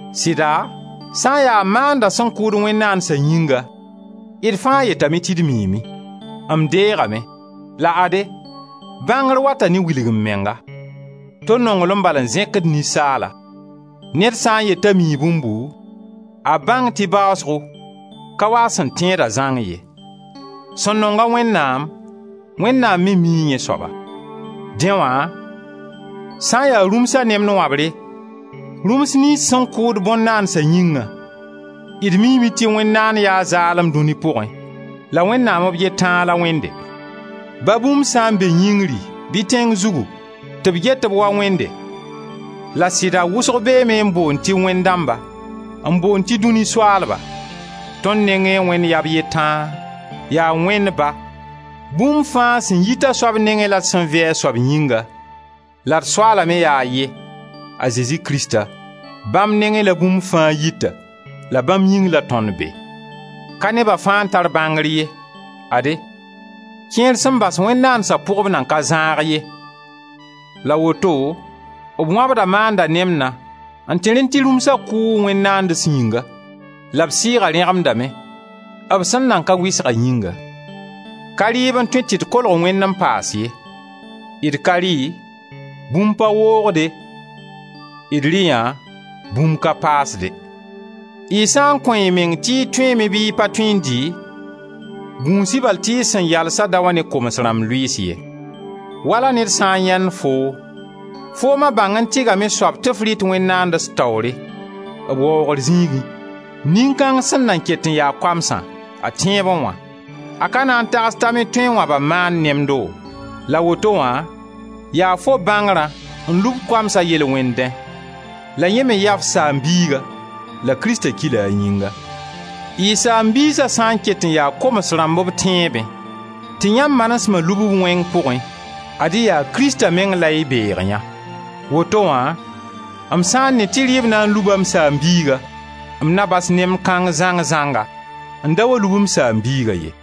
Sɩda, sã n ya maanda sẽn kʋʋd wẽn-naandsa yĩnga, d fãa yetame tɩ d miime; m deegame. La ade, bãngr wata ne wilg-m-menga. To nonglem bal n zẽkd ninsaala. Ned sã n yet t'a mii bũmbu, a bãng tɩ baasgo, ka waa a sẽn teeda zãng ye. Sẽn nong-a Wẽnnaam, Wẽnnaam me mii yẽ soaba. Dẽ wã, sã ya rũmsa nemd wãbre, rũms niyns sẽn kʋʋd bõn-naandsa yĩngã, d miime tɩ wẽn-naand yaa zaalem, dũni pʋgẽ, la Wẽnnaam b ye tãa la Wẽnde. Ba bũmb sã n be yĩngri bɩ tẽng zugu tɩ b get-b wa wẽnde -la sɩda wʋsg beeme n boond tɩ wẽnd dãmba, n boond tɩ dũni soaalba — tõnd nengẽ Wẽnd yaa b ye tãa, yaa Wẽnd Ba, bũmb fãa sẽn yit a soab nenge la d sẽn vɩ a soab yĩnga, la d Soaala me yaa a ye, a Zezi Krista, bãmb nengẽ la bũmb fãa yita la bãmb yĩng la tõnd be. Ka neba fãa n tar bãngr ye. Ade, kẽer sẽn bas wẽn-naandsa pʋgb nan ka zãag ye; la woto b wãbda maanda nemdã n tẽrẽ tɩ rũmsa kʋʋ wẽn-naands yĩnga la b sɩɩga rẽgemdame, b sẽn nan ka wɩsga yĩnga. Ka rɩɩb n tõe tɩ d kolg Wẽnd n paas ye. D ka rɩ, bũmb pa woogde, d rɩ yã, bũmb ka paasde. Y sã n kõ y meng tɩ y tõeeme bɩ y pa tõe n dɩ, gũus-y bal tɩ y sẽn yalsã da wa ne koms rãmb lʋɩɩs ye. Wala ned sã n yãend foo, foom a bãng-n-tɩgame soab, tɩ f rɩt wẽn-naands taoore, b waoogr zĩigẽ, nin-kãng sẽn nan ket n ya koamsã, a tẽebẽ wã, a ka na n tags t'a me tõe n wãba maand nemdo? La woto wã, yaa fo bãngrã n lub koamsã yel-wẽndẽ. La yẽ me yaa f saam-biiga, la Krista ki-la a yĩnga. Y saam-biisa sã n ket n ya koms rãmb b tẽebẽ tɩ yãmb manesma lub-b wẽng pʋgẽ, ad-y yaa Krista meng la y beg yã. Woto wã m sã n ne tɩ rɩɩb na n luba m saam-biiga, m na bas nemd kãng zãng-zãnga, n da wa lub m saam-biiga ye.